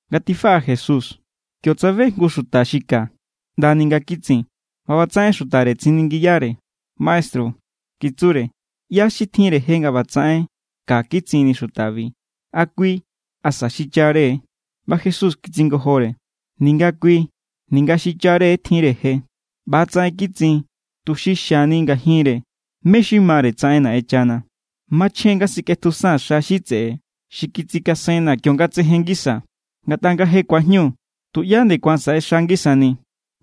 Nga tifaꞌa Jesús, kio tsabe jngu xuta xi ka ꞌndani nga kitsin. ꞌBa ꞌbatsaꞌen xutare tsiningiyare: —Maestru —kitsure—, ¿ꞌyá xi tjinre je nga ꞌbatsaꞌen ka kitsinni xutabi? ¿A kui? ¿Asa xichare? ꞌBa Jesús kitsingojore: —Ninga kui ninga xichare tjinre je. ꞌBa=tsaꞌen kitsin tuxi xiani ngajinre mé= xi mare tsaꞌen Naꞌenchana. Machjen= nga sikꞌetjusan xa xi tseꞌe xi kitsikasenna̱ kionga tsejen ngisaa̱. Ngatꞌa nga je ku̱ajñu, tuꞌyá nde ku̱an saꞌexa ngisani.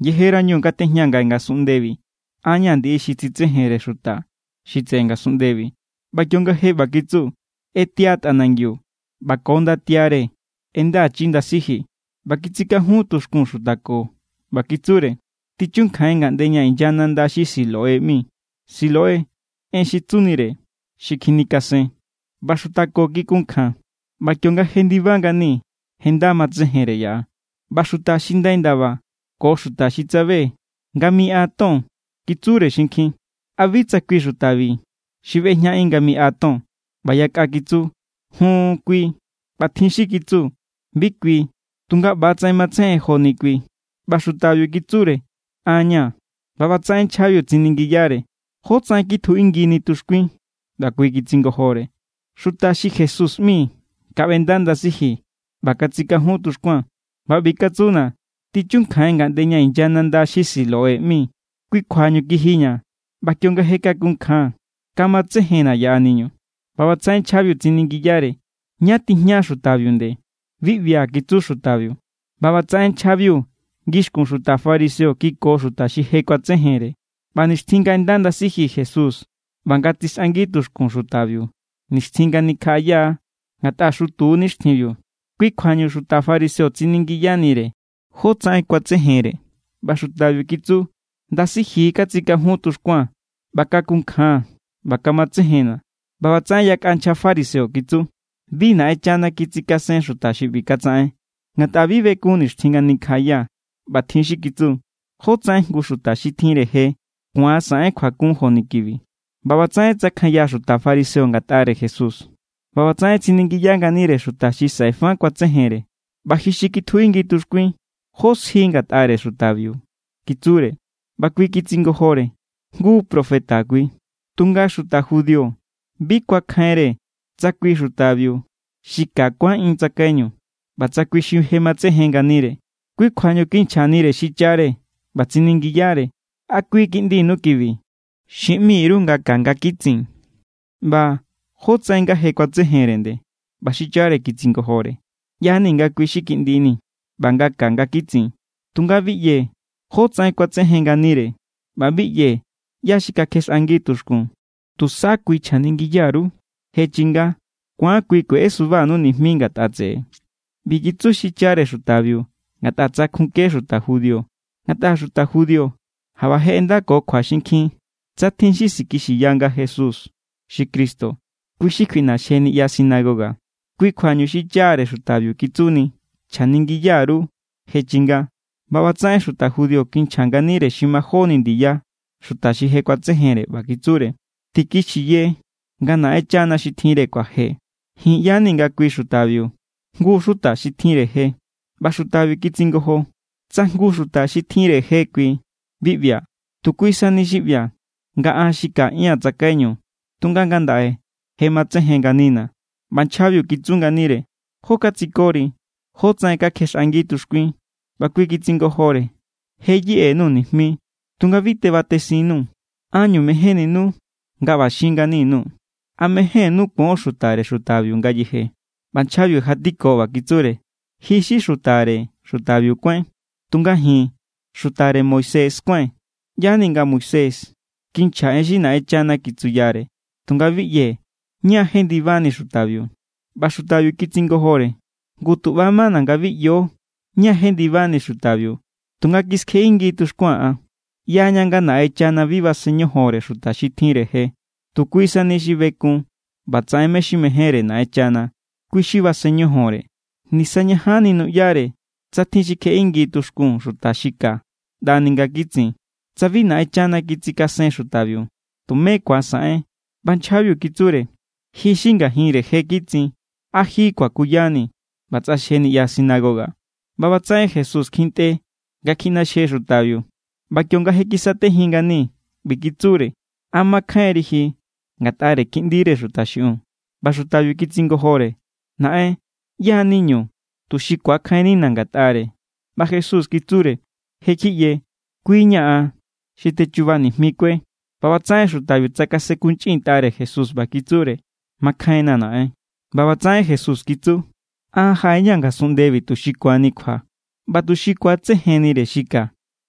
Yejerañu nga tejñaa̱ ngaꞌe ngasunꞌndebi, an ña̱ ndiꞌi xi tsitsejenre xuta xi tseꞌe ngasunꞌndebi. ꞌBa kionga je ꞌba kitsu, ꞌetia tꞌanangiu ꞌba ko ndatiare ꞌendachi ndasiji, ꞌba kitsikajun tuxkun xuta ko. ꞌBa kitsure: —Tichunkjain ngaꞌnde ña inya nanda xi Siloé ꞌmi. (Siloé, en xi tsunire: xi kjinikasen.) ꞌBa xuta ko kikunkjan, ꞌba kionga jendiba ngani, je nda matsejenre yaꞌa. ꞌBa xuta xi ndai ndaba ko xuta xi tsabe nga miꞌa ton kitsure xinkjin: —¿A bi tsa kui xutabi xi ꞌbejñaꞌin nga miꞌa ton? ꞌBa yakꞌa kitsu: —Jun, kui. ꞌBa tjin xi kitsu: —Bi kui, tunga ꞌba=tsaꞌen matsejen joni kui. ꞌBa xutabiu kitsure: —An= ña̱. ꞌBa ꞌbatsaꞌen nchjabiu tsiningiyare: —¿Jótsaꞌen kitjuꞌingini tuxkuin? ꞌBa kui kitsingojore: —Xuta xi Jesús ꞌmi kaꞌbenda ndasiji ꞌba katsikajun tuxkuaa̱n ꞌba ꞌbi katsuna̱: “Tichunkjain ngaꞌnde ña inya nanda xi Siloé ꞌmi.” Kui kjuañu kijiña̱ ꞌba kionga je kakunkjaa̱n, kamatsejenna̱ yaꞌaniñu. ꞌBa ꞌbatsaꞌen nchjabiu tsiningiyare: —¿Ñá tijña xutabiu nde? —Bi ꞌbia̱ —kitsu xutabiu. ꞌBa ꞌbatsaꞌen nchjabiu ngixkun xuta fariseo kiko xuta xi je kuatsejenre. ꞌBa nixtjin nga ꞌenda ndasiji Jesús ꞌba nga tsixꞌangi tuxkun xutabiu, nixtjin nga nikjaꞌaya= ngatꞌa xutu= nixtjinbiu. Kui kjuañu xuta fariseo tsiningiyanire jótsaꞌen kuatsejenre. ꞌBa xutabiu kitsu: —Ndasiji katsikajun tuxkuaa̱n, ꞌba kakunkjaa̱n ꞌba kamatsejenna̱. ꞌBa ꞌbatsaꞌen yakꞌa nchja fariseo kitsu: —Bi Naꞌenchana kitsikasen xuta xi ꞌbi katsaꞌen, ngatꞌa bi bekun nixtjin nga nikjaꞌaya. ꞌBa tjin xi kitsu: —¿Jótsaꞌen jngu xuta xi tjinre je ku̱an saꞌen kjuakun joni kibi? ꞌBa ꞌbatsaꞌen tsakjanya xuta fariseo ngatꞌare Jesús. ꞌBa ꞌbatsaꞌen tsiningiya nganire xuta xi saꞌe fa kuatsejenre: —ꞌBa ji xi kitjuꞌingi tuxkuin, ¿jó sji ngatꞌare xutabiu? —kitsure. ꞌBa kui kitsingojore: —Jngu profeta kui. Tunga xuta judío bi kuakjainre tsa kui xutabiu xi ka kuánꞌin tsakaiñu, ꞌba tsa kui xi je matsejen nganire. Kui kjuañu kinchjanire xichare ꞌba tsiningiyare: —¿A kui kiꞌndinu kibi xi ꞌmi_ru nga ka nga kitsin? ꞌBa ¿jótsaꞌen nga je kuatsejenre nde? ꞌBa xichare kitsingojore: —ꞌYa=ni̱ nga kui xi kiꞌndini̱ ꞌba nga ka nga kitsin. Tunga bi ꞌyee̱ jótsaꞌen kuatsejen nganire, ꞌba bi ꞌyee̱ ꞌyá xi kakjexꞌangi tuxkun. Tusa kui chjaningiya_ru. Je chinga. Ku̱an kui kueꞌesubanu nijmi ngatꞌa tseꞌe. ꞌBi kitsu xichare xutabiu ngatꞌa tsakjunke xuta judío. Ngatꞌa xuta judío jaꞌba je ꞌendakokjua xinkjin tsa tjin xi sikixiya nga Jesús= xi Cristo, kui= xi kjuiꞌnaxje niꞌya sinagoga. Kui kjuañu xichare xutabiu kitsuni: “Chjaningiya_ru. Je chinga.” ꞌBa ꞌbatsaꞌen xuta judío kinchja nganire xi majóni ndiya xuta xi je kuatsejenre ꞌba kitsure: —Tikixiye nga Naꞌenchana xi tjinre kjuaje. Ji̱n ꞌya=ni nga kui xutabiu jngu xuta xi tjinre je. ꞌBa xutabiu kitsingojo: —Tsa jngu xuta xi tjinre je kui, bi ꞌbia̱. Tu kui sani xi ꞌbia̱, nga an xi kaꞌia̱n tsakaiñu, tunga ngandaꞌe je matsejen nganina̱. ꞌBa nchjabiu kitsu nganire: —¿Jó katsikori? ¿Jótsaꞌen kakjexꞌangi tuxkuin? ꞌBa kui kitsingojore: —Je yeꞌe_nuu̱ nijmi, tunga bi tebatesinnuu̱. ¿Ánñu mejénninu nga ꞌba xin ngani_nuu̱? ¿A mejénnú kuon xutare xutabiu ngayeje? ꞌBa nchjabiu jatiko ꞌba kitsure: —Ji xi xutare xutabiu kuáin. Tunga ji̱n xutare Moisés kuái̱n. ꞌYa=ni̱ nga Moisés kinchja en xi Naꞌenchana kitsuyare, tunga bi ꞌyee̱ ñá= jendibani xutabiu. ꞌBa xutabiu kitsingojore: —Ngu, tu ꞌba= mana̱ nga bi ꞌyo ñá jendibani xutabiu, tunga kiskjeꞌingi tuxkuaa̱n an. ꞌYaña nga Naꞌenchana bi basen ñojonre xuta xi tjinre je. Tu kui sani xi bekun ꞌba tsaꞌen mé= xi mejénre Naꞌenchana, kui= xi basen ñojonre. Nisañajanni nuꞌyare tsa tjin xi kjexꞌangi tuxkun xuta xi ka ꞌndani nga kitsin. Tsa bi Naꞌenchana kitsikasen xutabiu, tumé ku̱an saꞌen. ꞌBa nchjabiu kitsure: —Ji= xi ngajinre je kitsin. ¿A ji kuakuyanii̱? ꞌBa tsꞌaxje niꞌya sinagoga. ꞌBa ꞌbatsaꞌen Jesús kjintꞌe nga kjiꞌnaxje xutabiu, ꞌba kionga kisatejin ngani ꞌbi kitsure: —¿A makjainri ji ngatꞌare Kiꞌndire Xuta xiꞌiun? ꞌBa xutabiu kitsingojore: —Naꞌen, ¿ꞌyá= niñu, tuxi ku̱akjainnina̱ ngatꞌare? ꞌBa Jesús kitsure: —Je= kjiꞌye. Kui= ña̱ an xi techuba nijmikue. ꞌBa ꞌbatsaꞌen xutabiu tsakasenkunchꞌintꞌare Jesús ꞌba kitsure: —Makjainna̱, Naꞌen. ꞌBa ꞌbatsaꞌen Jesús kitsu: —An jaꞌe=ña̱ ngasunꞌndebi tuxi ku̱anni kjua, ꞌba tuxi ku̱atsejennire xi ka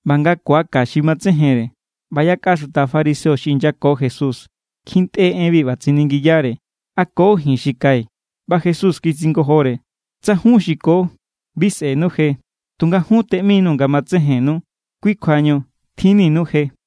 ꞌba nga ku̱aka xi matsejenre. ꞌBa yakꞌa xuta fariseo xi inyako Jesús kjintꞌe enbi ꞌba tsiningiyare: —¿A ko ji̱n xi kai̱? ꞌBa Jesús kitsingojore: —Tsa jun xi ko, bi sꞌe̱nu je. Tunga jun teꞌminuu̱ nga matsejennu. Kui= kjuañu tjinninu je.